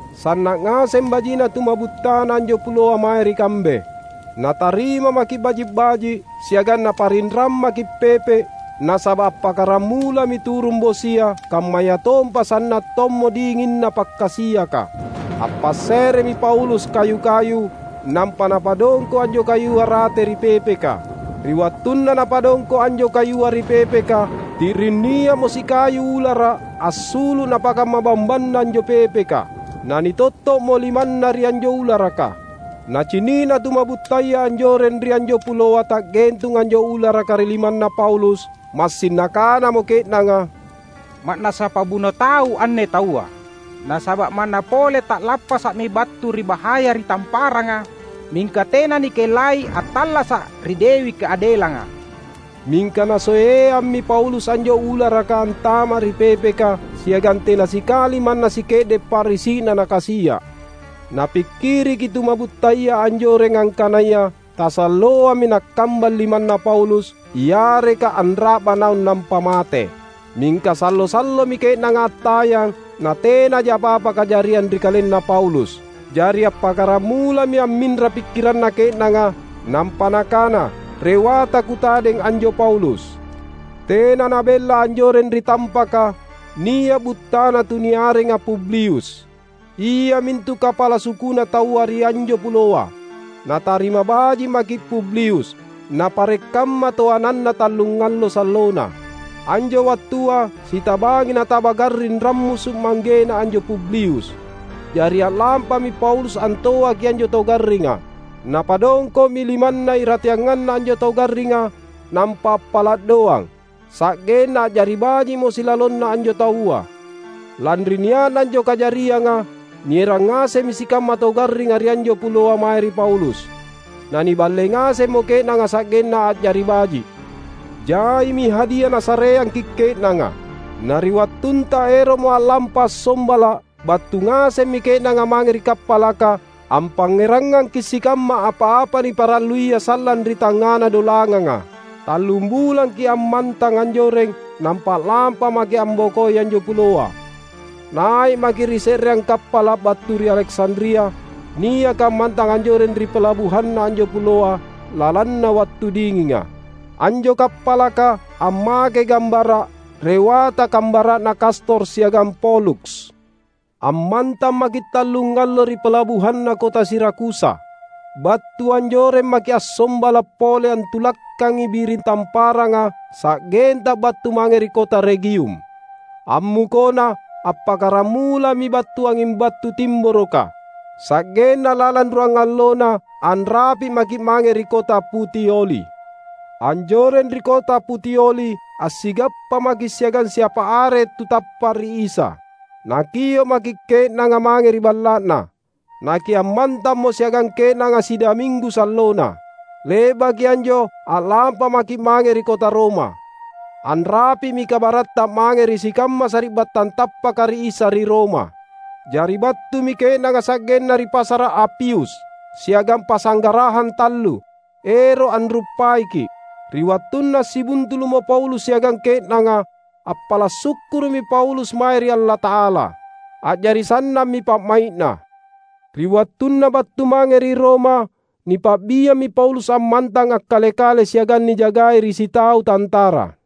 Sanna’ ngaseng baji’na tuma’buttana anjo puloa mae ri kambe. Natarima maki’ baji’-baji’ siagang naparinrang maki’ pepe’ nasaba’ appakkaramulami turung bosia kammayatompa sanna’ tommo dinginna pakkasiaka. Appasse’remi Paulus kayu-kayu, nampa napadongko’ anjo kayua rate ri pepeka. Ri wattunna napadongko’ anjo kayua ri pepeka, ti’ring nia’mo sikayu ulara’ assulu’ napakamma bambanna anjo pepeka. Nanitotto’mo limanna ri anjo ularaka. Nacini’na tuma’buttaya anjoreng ri anjo puloa ta’gentung anjo ularaka ri limanna Paulus, massing nakanamo ke’nanga, "Ma’nassa pabuno tau anne taua. Nasaba’ manna pole ta’lappasa’mi battu ri bahaya ri tamparanga, mingka tena nikellai attallasa’ ri Dewi Kaadelanga." Mingka nasoeammi Paulus anjo ularaka antama’ ri pepeka siagang tena sikali manna sike’de’ pa’risi’na nakasia’. Napikkiriki tuma’buttaya anjoreng angkanaya tasalloami nakkambang limanna Paulus, yareka anra’ba naung nampa mate. Mingka sallo-sallomi ke’nanga attayang natenaja apa-apa kajariang ri kalenna Paulus. Jari appakkaramulami amminra pikkiranna ke’nanga, nampa nakana rewata kutadeng anjo Paulus. Tena nabella anjoreng ri tampaka, nia’ buttana tuniarenga Publius, iamintu kapala sukuna taua ri anjo puloa. Natarima baji’ maki’ Publius, napare’ kamma toananna tallungallo sallona. Anjo wattua sitabangi nataba garring rammusu’ manggena anjo Publius. Jari a’lampami Paulus antoaki anjo tau garringa. Napadongko’mi limanna irateanganna anjo tau garringa nampa appala’ doang, sa’genna a’jari baji’mo silalonna anjo taua. Lanri nia’na anjo kajarianga, nierang ngasemmi sikamma tau garringa ri anjo puloa mae ri Paulus. Naniballei ngasemmo ke’nanga sa’genna a’jari baji’. Jaimi hadia nasareangki’ ke’nanga. Na ri wattunta ero’mo a’lampa assombala’ battu ngasemmi ke’nanga mange ri kappalaka ampangngerangangki’ sikamma apa-apa niparalluia sallang ri tangngana dolanganga. Tallum bulangki’ ammantang anjoreng, nampa a’lampa maki’ ambokoi anjo puloa. Nai’ maki’ ri se’reang kappala’ battu ri Aleksandria, niaka ammantang anjoreng ri palabuhanna anjo puloa lalanna wattu dinginga. Anjo kappalaka ammakei gambara’"Rewata Kambara’na Kastor siagang Poluks." Ammantang maki’ tallungallo ri palabuhanna kota Sirakusa. Battu anjoreng maki’ assombala’ pole antulakkangi biring tamparanga sa’genta battu mange ri kota Regium. Ammukona, appakkaramulami battu anging battu timboroka, sa’genna lalang ruangallona anrapi’ maki’ mange ri kota Putioli. Anjoreng ri kota Putioli assigappa maki’ siagang siapa are tu tappa’ ri Isa. Nakio’ maki’ ke’nanga mange ri balla’na. Nakiammantammo siagang ke’nanga sidaminggu sallona. Le’baki anjo a’lampa maki’ mange ri kota Roma. Anrapi’mi kabaratta mange ri sikamma sari’battang tappaka ri Isa ri Roma. Jari battumi ke’nanga sa’genna ri Pasara’ Apius siagang Pasanggarahang Tallu, ero’ anruppaiki’. Ri wattunna assibuntulu’mo Paulus siagang ke’nanga, appala’ sukkuru’mi Paulus mae ri Allata’ala. A’jari sannammi pa’mai’na. Ri wattunna battu mange ri Roma nipa’biammi Paulus ammantang akkale-kale siagang nijagai ri sitau tantara.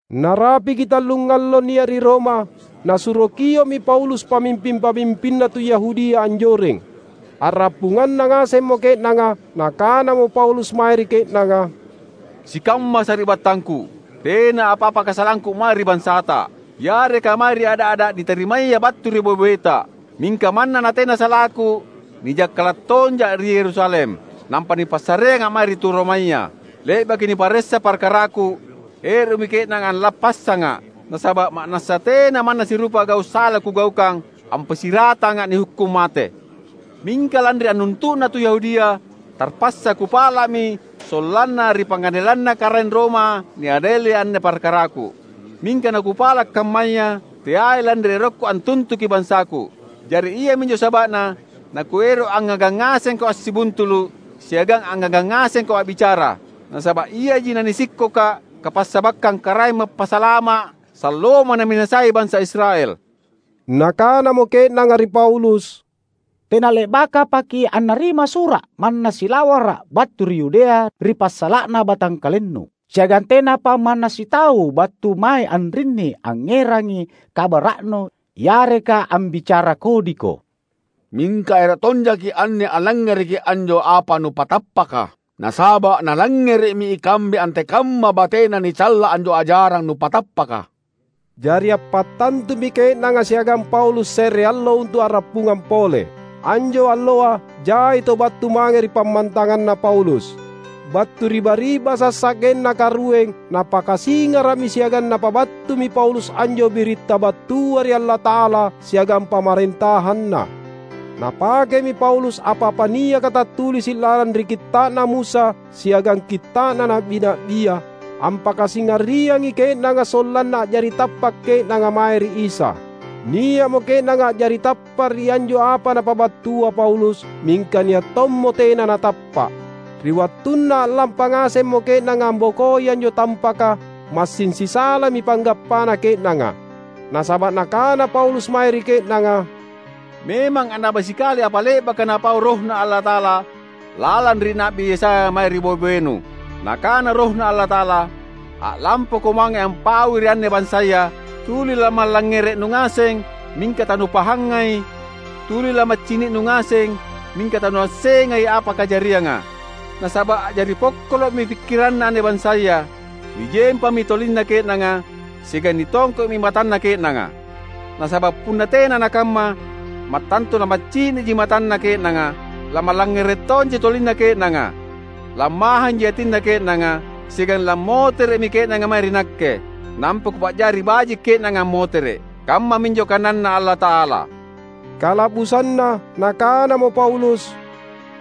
Narapiki tallungallo nia’ ri Roma, nasuro kio’mi Paulus pamimping-pamimpinna tu Yahudia anjoreng. A’rappunganna ngasemmo ke’nanga, nakanamo Paulus mae ri ke’nanga, "Sikamma sari’battangku! Tena apa-apa kasalangku mae ri bansata, yareka mae ri ada’-ada’ nitarimaya battu ri boe-boeta. Mingka manna natena salaku nijakkala’ tonja’ ri Yerusalem, nampa nipassareanga’ mae ri tu Romaya. Le’baki niparessa parkaraku, ero’mi ke’nanga allappassanga’, nasaba’ ma’nassa tena manna sirupa gau’ sala kugaukang ampassiratanga’ nihukkung mate. Mingka lanri annuntu’na tu Yahudia, tarpassa kupala’mi sollanna ri pangadelanna Karaeng Roma niadeli anne parkaraku. Mingka nakupala’ kammaya, teai lanri erokku antuntuki bansaku. Jari iaminjo saba’na nakuero’ angngagang ngasengko assibuntulu’ siagang angngagang ngasengko a’bicara. Nasaba’ iaji nanisikkoka’ kapassabakkang Karaeng Mappasalama’ salloamo naminasai bansa Israel." Nakanamo ke’nanga ri Paulus, "Tena le’bakapaki’ annarima sura’ manna silawara’ battu ri Yudea ri passala’na batangkalennu. Siagang tenapa manna sitau battu mae anrinni angngerangi kabara’nu, yareka ambicara kodiko. Mingka ero’ tonjaki’ anne allangngereki anjo apa nupatappaka, nasaba’ nalangngere’mi ikambe antekamma batena nicalla anjo ajarang nupatappaka." Jari appattantumi ke’nanga siagang Paulus se’re allo untu’ a’rappungang pole. Anjo alloa jai tau battu mange ri pammantanganna Paulus. Battu ri bari’basa’ sa’genna karueng napakasingara’mi siagang napabattumi Paulus anjo biritta battua ri Allata’ala siagang Pamarentahanna. Napakemi Paulus apa-apa niaka tattulisi’ lalang ri Kitta’na Musa siagang Kitta’na Na’bi-na’bia, ampakasingariangi ke’nanga sollanna a’jari tappa’ ke’nanga mae ri Isa. Nia’mo ke’nanga a’jari tappa’ ri anjo apa napabattua Paulus, mingka nia’ tommo tena natappa’. Ri wattunna a’lampa ngasemmo ke’nanga ambokoi anjo tampaka massing sisalami panggappana ke’nanga. Nasaba’ nakana Paulus mae ri ke’nanga, "Memang annaba sikali apa le’baka Napau RohNa Allata’ala lalang ri Na’bi Yesaya mae ri boe-boenu! Nakana RohNa Allata’ala, ‘A’lampako mange ampaui ri anne bansaya: Tuli lamallangngere’nu ngaseng, mingka tanupahangai; tuli lamaccini’nu ngaseng, mingka tanuassengai apa kajarianga. Nasaba’ a’jari pokkolo’mi pikkiranna anne bansaya, nijempammi tolinna ke’nanga, siagang nitongko’mi matanna ke’nanga. Nasaba’ punna tena nakamma, mattantu lamaccini’ji matanna ke’nanga, lamallangngere’ji tolinna ke’nanga, lammahanji atinna ke’nanga, siagang lammotere’mi ke’nanga mae ri Nakke, nampa Kupa’jari baji’ ke’nanga ammotere’,’ kammaminjo kananNa Allata’ala." Kala’busanna, nakanamo Paulus,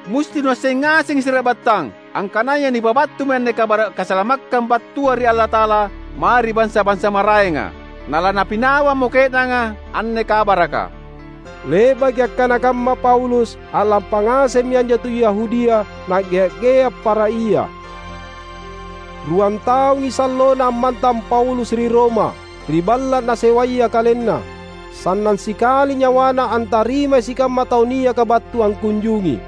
"Musti nuasseng ngasengi sari’battang, angkanaya nipabattumi anne kabara’ kasalamakkang battua ri Allata’ala mae ri bansa-bansa maraenga. Nalanapinawammo ke’nanga anne kabaraka!" [Le'baki akkana kamma Paulus, a'lampa ngasemmi anjo tu Yahudia, na'gea'-gea' para ia.] Ruan taungi sallona ammantang Paulus ri Roma, ri balla’ nasewaya kalenna. Sannang sikali nyawana antarimai sikamma tau niaka battu angkunjungi.